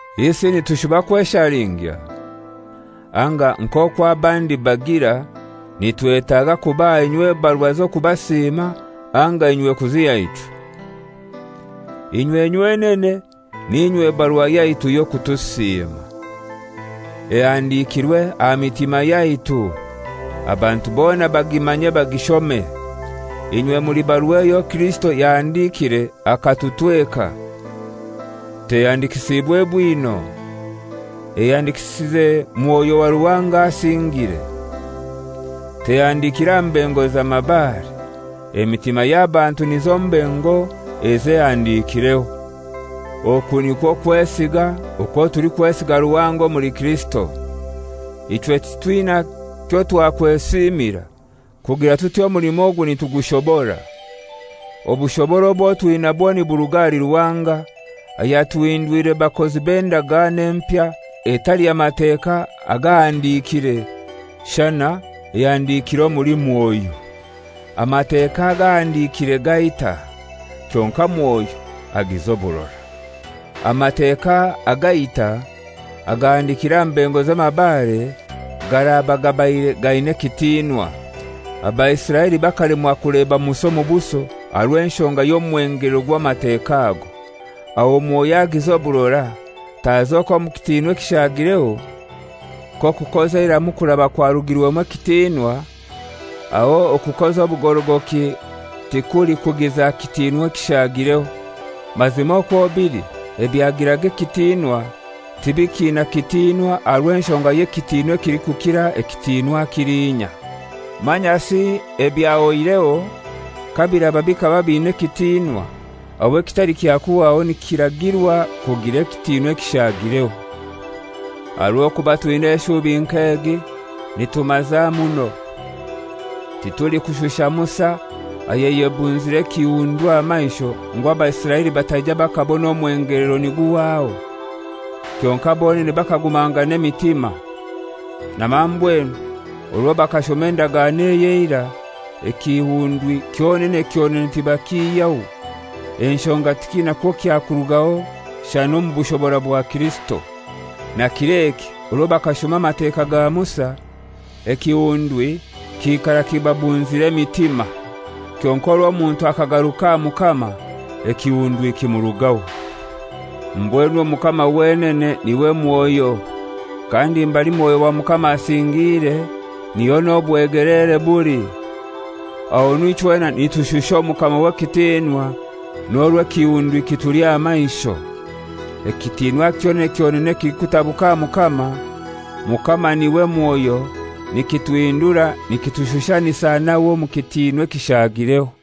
Isi nitushuba kweshalingya? Anga nk'okwo abandi bagira, nitwetaaga kubaha inywe ebarua z'okubasiima, anga inywe kuziha ichwe? Inywe nywenene n'inywe barua yaitu y'okutusiima, ehandikirwe aha mitima yaitu, abantu bona bagimanye bagishome. Inywe muli barua eyo Kirisito yahandikiire akatutweka. Tehandikisiibwe bwino, ehandikisize Mwoyo wa Ruhanga asingire. Tehandikire aha mbengo za mabare, emitima y'abantu nizo mbengo ezo ehandikireho. Oku nikwo kwesiga okwo tulikwesiga Ruhanga omuli Kirisito. Ichwe titwina kyotwakwesiimira kugira tuti omulimo ogu nitugushobora. Obushobora obwo twinabwo niburuga ahali Ruhanga, ayatuhindwire bakozi b'endagano empya, etali ya Mateka agahandikire shana ehandikire omuli Mwoyo. Amateka agahandikire gaita, kyonkai Mwoyo agiza oburora. Amateka agaita, agahandikire aha mbengo z'amabare, garaba gabaire gaina ekitinwa, Abaisiraeli bakalemwa kuleba Musa omu buso aha rw'enshonga y'omwengelero gw'Amateka ago, aho Mwoyo agiza oburora tazoke omu kitinwa ekishagireho? Kokukoza eiramu kuraba kwarugirwemu ekitinwa; aho okukoza obugorogoki tikulikugiza kitinwa ekishagireho! Mazima okwo bili, ebyagiraga ekitinwa tibikiina kitinwa aha rw'enshonga y'ekitinwa ekilikukira ekitinwa kilinya. Manyasi ebyahoireho kabiraba bikaba bina ekitinwa, aho ekitali kya kuhwaho nikiragirwa kugira ekitinwa ekishagireho. Aha rw'okuba twina eshubi nk'egi, nitumaza muno. Titulikushusha Musa ayayebunzire ekihundwi aha maisho ngu Abaisiraeli bataija bakabona omwengelero niguhwaho. Kyonkai bonene bakagumangana emitima. Na mambwenu, orwo bakashoma endagano ey'eira, ekihundwi kyonene kyonene tibakihyaho, enshonga tikiina kwo kyakurugaho shana omu bushobora bwa Kirisito. Na kir'eki orwo bakashoma Amateka ga Musa, ekihundwi kiikara kibabunzire emitima. Kyonkai orwo omuntu akagaruka aha Mukama ekihundwi kimurugaho. Mbwenu Omukama wenene n'iwe Mwoyo, kandi mbali Mwoyo wa Mukama asingiire, niho n'obwegeleere buli. Ahonu ichwena nitushusha Omukama w'ekitinwa n'orwo ekihundwi kituli aha maisho. Ekitinwa kyonene kyonene ekilikutabuka aha Mukama, Mukama n'iwe Mwoyo, nikituhindura nikitushushanisa nawe omu kitinwa ekishagireho.